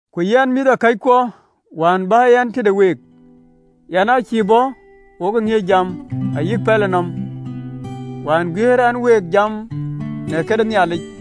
Ku yɛn, mïthëkɔckuɔ, wään bän tëde week, yɛn aa cïï bɔ̈ wo ŋiëc jam ayï pɛlënɔm, wään guiëër ɛn week jam në këde Nhialic.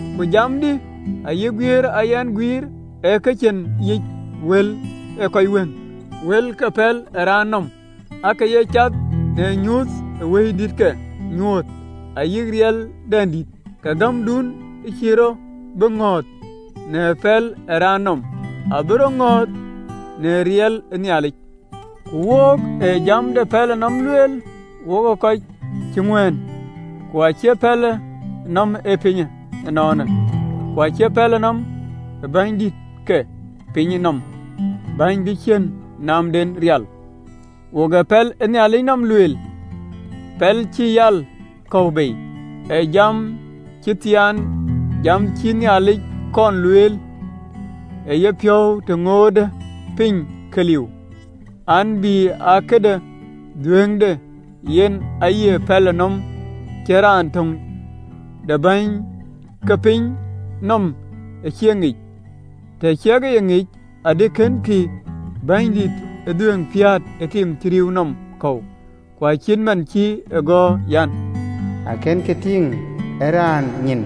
Ku jamdï ayï guiëër ë ya yɛn guïïr aake cïn yiic wël ee kɔc wëŋ, wël ke pɛlënɔm de raan, aake ye cath në nyuuth ee Wëidït ke nyuɔɔth ayï riɛldɛndït, ke gämdun cïï rɔt bï ŋɔ̈ɔ̈th në pɛl ë raan nɔm, abï rɔt ŋɔ̈ɔ̈th në riɛldïït ë Nhialic. Ku wok ee jam de pɛlënɔm lueel wokë kɔc cï ŋuɛ̈ɛ̈n, ku acie pɛlënɔm ee pinyë ënɔɔnë, ku acie pɛlënɔm ë bänydït ke pinyë nɔm, bäny bï ciën naamden rial. Wok ee pɛlënɔm de Nhialic lueel, pɛl cï yäl kɔ̈u bei, ee jam cï thiaan, jam cïï Nhialic kɔn lueel ë yepiɔ̈u të ŋootë piny ke liu an, bï aa këde dhuëëŋde. Yen aye pɛlënɔm cïn raan töŋ de bäny ke pinyë nɔm ë cï e ŋic, tëë cïk ŋic, adï kënkï Bɛ̈nydïït de dhuëëŋ piäät ë tim cï rïïu nɔm kɔ̈u. Ku acït man cï e gɔ̈ɔ̈r an: “Akënë ke tïŋ ë raan nyin,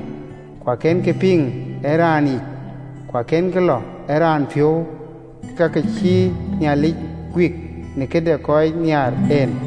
ku akënë ke piŋ ë raan yïc, ku akënkï lɔ ë raan piɔ̈u, Kek ka cïï Nhialic guik në këde kɔc nhiaar en.”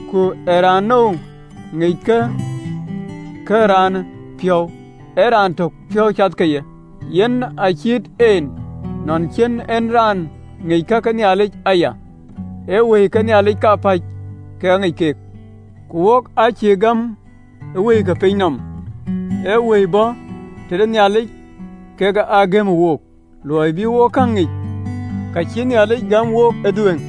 Ku ee raanou ŋic ka ke raan, ee piɔ̈n ë raan etök, piɔ̈n cath ke ye? Yen acït en nɔn cïn en raan ŋic ka ke Nhialic aya, ee Wëi ke Nhialic kapäc, kek aŋic keek. Ku wok aa cïï gɛ̈më wëi ke piny nɔm, ee wëi ë bɔ̈ tëde Nhialic kek aa gɛ̈më wook, luɔi bï wo käŋ ŋic ka cïï Nhialic gäm wook ëdhuëëŋ.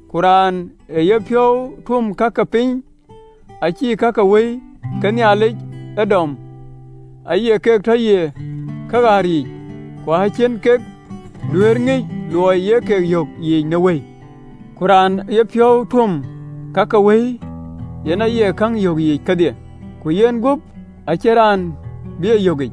Ku raan ë yepiɔ̈u tuöm ka ke piny acïï ka ke Wëi ke Nhialic ee dɔm, aye keek tɔ ye kaɣäär yiic, ku acïï keek duëër ŋic, luɔi ye ke yök yiic në Wëi. Ku raan ë yepiɔ̈u tuöm ka ke Wëi, yen aye käŋ yök yiic kedhie, ku yenguöp acïn raan bï ye yökic.